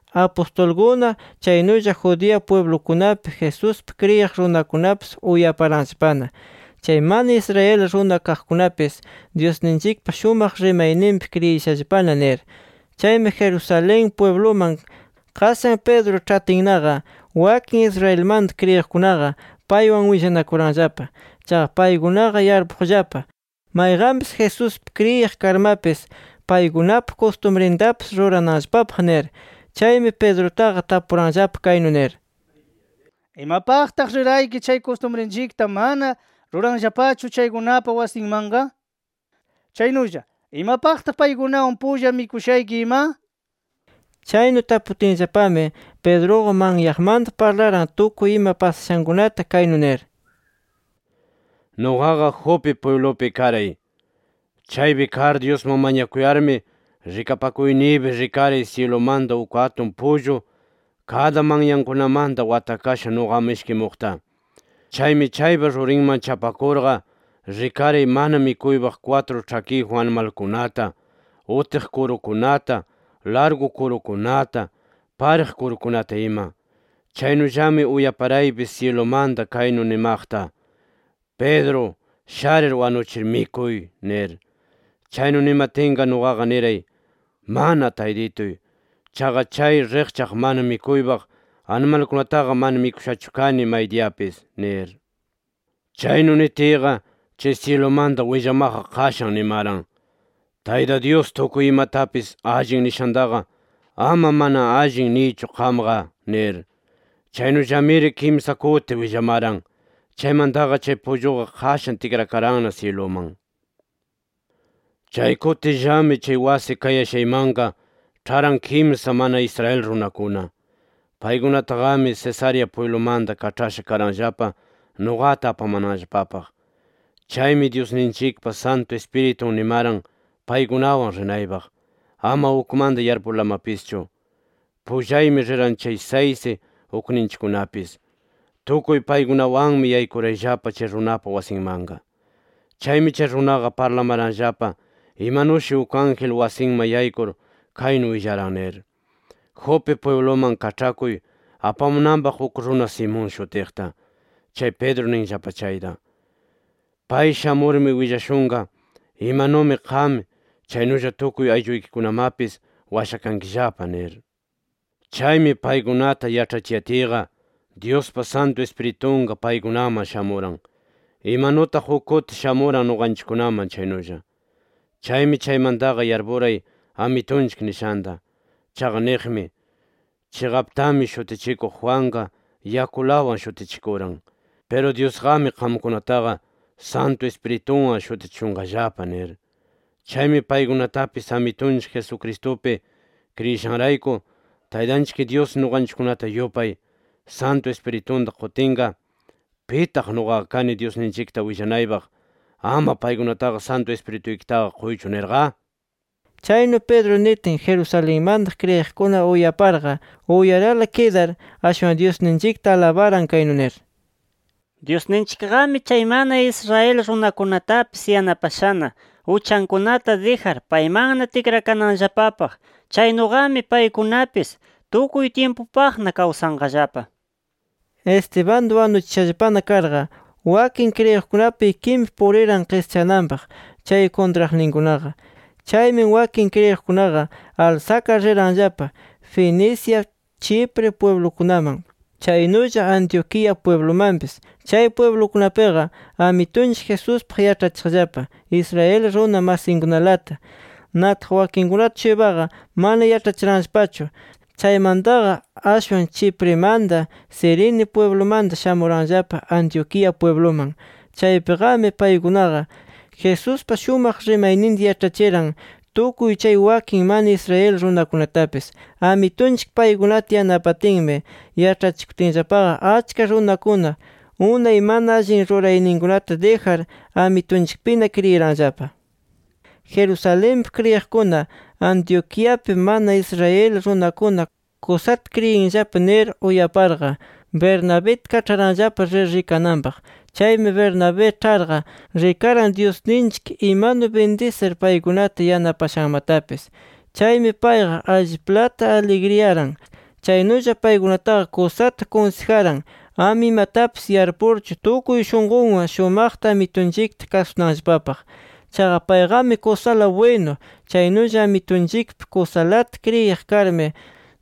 Apustulkuna, chaynulla Judea pwiblukunapi Jesuspi kriyiq runakunapis uyaparanllapana, “Chay mana Israel runa kaqkunapis, Dyusninchikpa shumaq rimayninpi kriyishallapana” nir. Chaymi Jerusalén pwibluman qashan Pedro ĉhatinnaqa wakin Israelmanta kriyiqkunaqa, paywan willanakuranllapa. Chaqa paykunaqa yarpuqllapa, mayqanpis Jesuspi kriyiq karmapis, paykunapa kustumrintapis rurananllapapaq nir. Chaymi Pedrutaqa tapuranllapa kaynu nir: —¿Imapaqtaq rirayki chay kustumrinchikta mana ruranllapachu chaykunapa wasinmanqa? Chaynulla ¿imapaqtaq paykunawan pulla mikushayki ima? nir. Chaynu taputinllapami, Pedruqa manyaqmanta parlaran tukuy ima pasashankunata, kaynu nir: —Nuqaqa Jope pwiblupi karay. Chaypi kar Dyusman mañakuyarmi, rikapakuyniypi rikaray syilumanta uk atun pullu kada manyankunamanta watakasha nuqaman ishkimuqta. Chaymi, chaypa rurinman chapakurqa rikaray mana mikuypaq kwatru ĉhakiyjun animalkunata, utiq kurukunata, largu kurukunata, pariq kurukunata ima. Chaynullami uyaparaypis syilumanta kaynu nimaqta: ‘Pedro sharir wanuchir mikuy’ nir. “Chaynu nimatinqa nuqaqa niray: ‘Mana Taytituy. Chaqa chay riqchaq mana mikuypaq animalkunataqa mana mikushachu kani maydiyapis’ nir. “Chaynu nitiyqa, chay syilumanta willamaqqa qashan nimaran: ‘Tayta Dyus tukuy imatapis “Allin” nishantaqa, ama “Mana allin” niychu qamqa’ nir. Chaynullamiri kimsa kuti willamaran. Chaymantaqa chay pulluqa qashan tikrakaranna syiluman. “Chay kutillami, chay wasi kayashaymanqa ĉharan kimsa mana Israel runakuna. Paykunataqami, Cesarea pwiblumanta kaĉhasha karanllapa nuqata apamananllapapaq. Chaymi, Dyusninchikpa Santu Ispiritun nimaran paykunawan rinaypaq, ama ukmanta yarpurlamapischu. Pullaymi riran kay saysi ukninchikkunapis. Tukuy paykunawanmi yaykurayllapa chay runapa wasinmanqa. Chaymi chay runaqa parlamaranllapa imanushi uk ángel wasinman yaykur kaynu willaran nir: ‘Jope pwibluman kaĉhakuy apamunanpaq uk runa Simón shutiqta, chay Pedro ninllapa chayta. Pay shamurmi willashunqa, imanumi qam, chaynulla tukuy aylluykikunamapis washakankillapa’ nir. “Chaymi, paykunata yaĉhachiyatiyqa, Dyuspa Santu Ispiritunqa paykunaman shamuran, imanutaq uk kuti shamuran nuqanchikkunaman chaynulla. Chaymi chaymantaqa yarpuray Amitunchik nishanta. Chaqa niqmi: ‘Chiqaptami Shutichikuq Juanqa yakulawan shutichikuran. Piru Dyusqami qamkunataqa Santu Ispiritunwan shutichishunqallapa’ nir. Chaymi paykunatapis, Amitunchik Jesucristupi kriyishanrayku, Taytanchik Dyus nuqanchikkunata yupay, Santu Ispiritunta qutinqa, ¿pitaq nuqaqa kani Dyusninchikta willanaypaq ‘Ama paykunataqa Santu Ispirituykitaqa quychu’ nirqa?” Chaynu Pedro nitin, Jerusalenmanta kriyiqkuna uyaparqa uyarala kidar, ashwan Dyusninchikta alabaran kaynu nir: “Dyusninchikqami chay mana Israel runakunatapis yanapashana, uchankunata dijar paymanna tikrakananllapapaq. ¡Chaynuqami paykunapis tukuy tyimpupaqna kawsanqallapa!” Estebanta wanuchishallapana karqa, wakin kriyiqkunapa ikinpi puriran qischananpaq chay kuntraqninkunaqa. Chaymi wakin kriyiqkunaqa alsakar riranllapa, Fenicia, Chipre pwiblukunaman, chaynulla Antioquía pwiblumanpis. Chay pwiblukunapiqa Amitunchik Jesuspaq yaĉhachiqllapa Israel runa masinkunalata. Nataq, wakinkunata-shuypaqa mana yaĉhachiranllapachu. Chaymantaqa ashwan, Chiprimanta, Cirene pwiblumanta shamuranllapa Antioquía pwibluman. Chaypiqami paykunaqa Jesuspa shumaq rimayninta yaĉhachiran tukuy chay wakin mana Israel runakunatapis. Amitunchik paykunata yanapatinmi yaĉhachikutinllapaqa, achka runakuna unay mana allin rurayninkunata dijar, Amitunchikpina kriyiranllapa. Jerusalenpi kriyiqkuna “Antioquiapi mana Israel runakuna kusata kriyinllapa” nir uyaparqa, Bernabita kaĉharanllapa, rir rikananpaq. Chaymi, Bernabé ĉharqa rikaran, Dyusninchik imanu bindisir paykunata yanapashanmatapis. Chaymi payqa alliplata aligriyaran. Chaynulla paykunataqa kusata kunsijaran, ama imatapis yarpurchu, tukuy shunqunwan shumaqta Amitunchikta kasunanllapapaq. Chaqa payqami kusala bwinu, chaynulla Amitunchikpi kusalata kriyiq karmi,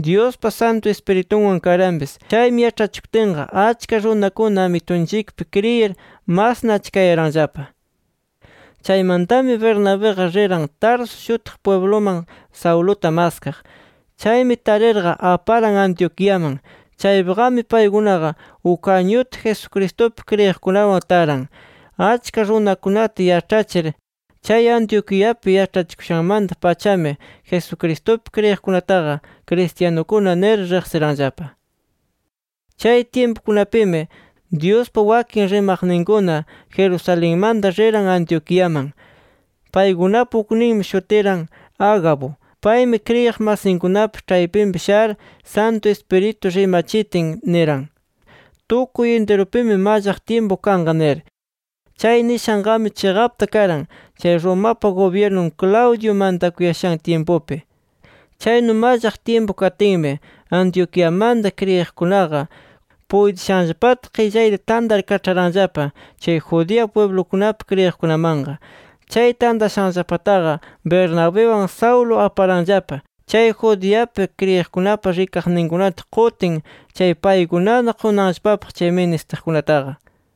Dyuspa Santu Ispiritunwan karanpis. Chaymi yaĉhachikutinqa, achka runakuna Amitunchikpi kriyir masna achkayaranllapa. Chaymantami Bernabiqa riran Tarso shutiq pwibluman, Sauluta maskaq. Chaymi tarirqa, aparan Antioquiaman. Chaypiqami paykunaqa uk añuta, Jesucristupi kriyiqkunawan taran, achka runakunata yaĉhachir. Chay Antioquiapi yaĉhachikushanmanta-pachami Jesucristupi kriyiqkunataqa cristianukuna nir riqsiranllapa. Chay tyimpukunapimi Dyuspa wakin rimaqninkuna, Jerusalenmanta riran Antioquiaman. Paykunapa ukninmi shutiran Agabo. Paymi kriyiq masinkunapa ĉhaypinpi shar, Santu Ispiritu rimachitin, niran: “Tukuy intirupimi mallaq tyimpu kanqa” nir. Chay nishanqami chiqapta karan, chay Romapa gubyirnun Claudio mantakuyashan tyimpunpi. Chaynu mallaq tyimpu katinmi, Antioquiamanta kriyiqkunaqa, puytishanllapata qillayta tantar kaĉharanllapa chay Judea pwiblukunapi kriyiqkunamanqa. Chay tantashanllapataqa Bernabiwan Saulo aparanllapa chay Judeapi kriyiqkunapa rikaqninkunata qutin, chay paykunana qunanllapapaq chay ministiqkunataqa.